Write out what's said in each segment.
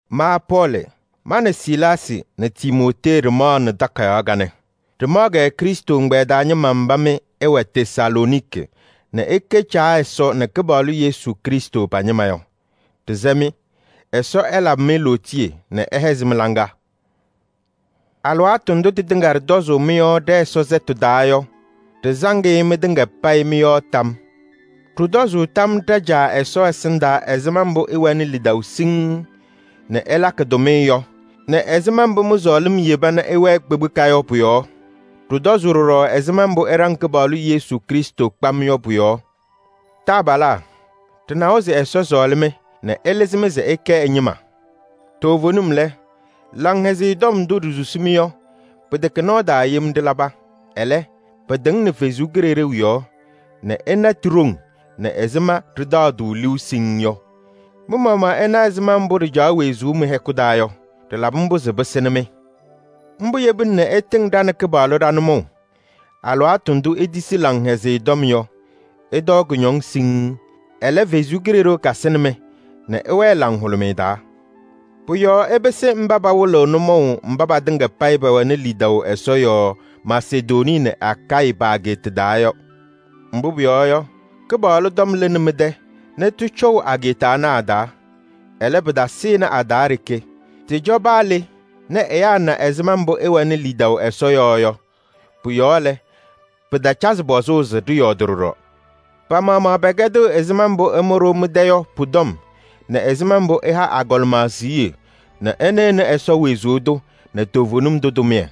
Ma Pɔɔlɩ, ma nɛ Silaasɩ nɛ Timootee ɖɩmaɣnɩ takayaɣ kanɛ. Ɖɩmaɣ-kɛ Krɩstʋ ɛgbɛyɛ taa ñɩma mba mɩ ɩwɛ Tesalooniki nɛ ɩkɛ Caa Ɛsɔ nɛ Kɩpaɣlʋ Yesu Krɩstʋ pa-ñɩma yɔ. Ɖɩsɛ-mɩ: Ɛsɔ ɛlabɩ-mɩ lootiye nɛ ɛhɛzɩ mɩ-laŋa! Alɩwaatʋ ndʋ tɩtɩŋa ɖɩtɔzʋʋ mɩ-yɔɔ ɖɛ-Ɛsɔ sɛtʋ taa yɔ, ɖɩsaŋ-ɩ mɩtɩŋa payɩ mɩ-yɔɔ tam yɔɔ. Ɖɩtɔzʋʋ tam yɔɔ ɖa-Caa Ɛsɔ ɛsɩndaa ɛzɩma mbʋ ɩwɛnɩ lidaʋ siŋŋ nɛ ɩlakɩ tʋmɩyɛ yɔ nɛ ɛzɩma mbʋ mɩ-sɔɔlɩm yeba nɛ ɩwɛɛ kpekpeka yɔ pʋ-yɔɔ. Ɖɩtɔzʋʋ ɖɔɖɔ ɛzɩma mbʋ ɩɖaŋ Kɩpaɣlʋ Yesu Krɩstʋ kpam yɔ pʋ-yɔɔ. Taabalaa! Ɖɩnawa se Ɛsɔ sɔɔlɩ-mɩ nɛ ɛlɩzɩ-mɩ se ɩkɛ ɛ-ñɩma. Toovenim lɛ, Laŋhɛzɩyɛ Tɔm ndʋ ɖisusi-mɩ yɔ, pɩtɛkɛ nɔɔ taa yem ɖɩlaba. Ɛlɛ, pɩtɩŋnɩ Ɛsɔ Kalɩzaɣ yɔɔ nɛ ɩna ti-ɖoŋ nɛ ɛzɩma ɖɩtaɣ-tʋ liu siŋŋ yɔ. Mɩ-maɣmaɣ ɩna ɛzɩma mbʋ ɖɩcaɣ wezuu mɩ-hɛkʋ taa yɔ, ɖɩlabɩ mbʋ se pɩsɩnɩ-mɩ. Mbʋ yebina nɛ ɩtɩŋ ɖa nɛ Kɩpaɣlʋ ɖa-nʋmɔʋ. Alɩwaatʋ ndʋ itisi Laŋhɛzɩyɛ Tɔm yɔ, ɩtɔɔ kʋñɔŋ siŋŋ. Ɛlɛ, Ɛsɔ Kalɩzaɣ kasɩnɩ-mɩ nɛ ɩwɛɛ laŋhʋlʋmɩyɛ taa. Pʋ-yɔɔ ɩpɩsɩ mba pawɩlɩɣ nʋmɔʋ mba patɩŋa payɩ pɛwɛnɩ lidaʋ Ɛsɔ yɔɔ Masedonii nɛ Akayɩ pa-ageeta taa yɔ. Mbʋ pʋyɔɔ yɔ, Kɩpaɣlʋ tɔm lɩnɩ mɩ-tɛ nɛ tɩcɔʋ ageeta ana a-taa. Ɛlɛ, pɩtasɩnɩ a-taa ɖeke, tɩcɔ paa le nɛ ɛyaa na ɛzɩma mbʋ ɩwɛnɩ lidaʋ Ɛsɔ yɔɔ yɔ. Pʋ-yɔɔ lɛ, pɩtacazɩ pɔzʋʋ se ɖɩyɔɔdɩ ɖɔɖɔ. Pa-maɣmaɣ pɛkɛdɩɣ ɛzɩma mbʋ ɩmʋ-ɖʋ mɩ-tɛ yɔ pʋ-tɔm nɛ ɛzɩma mbʋ ɩha agɔlɩma siɣye nɛ ɩnɩɣnɩ Ɛsɔ wezuu tʋ nɛ toovenim tʋ tʋmɩyɛ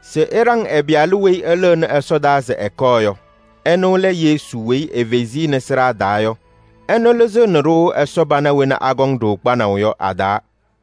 se ɩɖaŋ ɛ-Pɩyalʋ weyi ɛlɩɣnɩ ɛsɔdaa se ɛkɔɔ yɔ. Ɛnʋ lɛ Yesu weyi efezi-i nɛ sɩɖaa taa yɔ. Ɛnʋ lɩzɩɣnɩ-ɖʋ Ɛsɔ pana wena akɔŋ-ɖʋ kpanaʋ yɔ a-taa.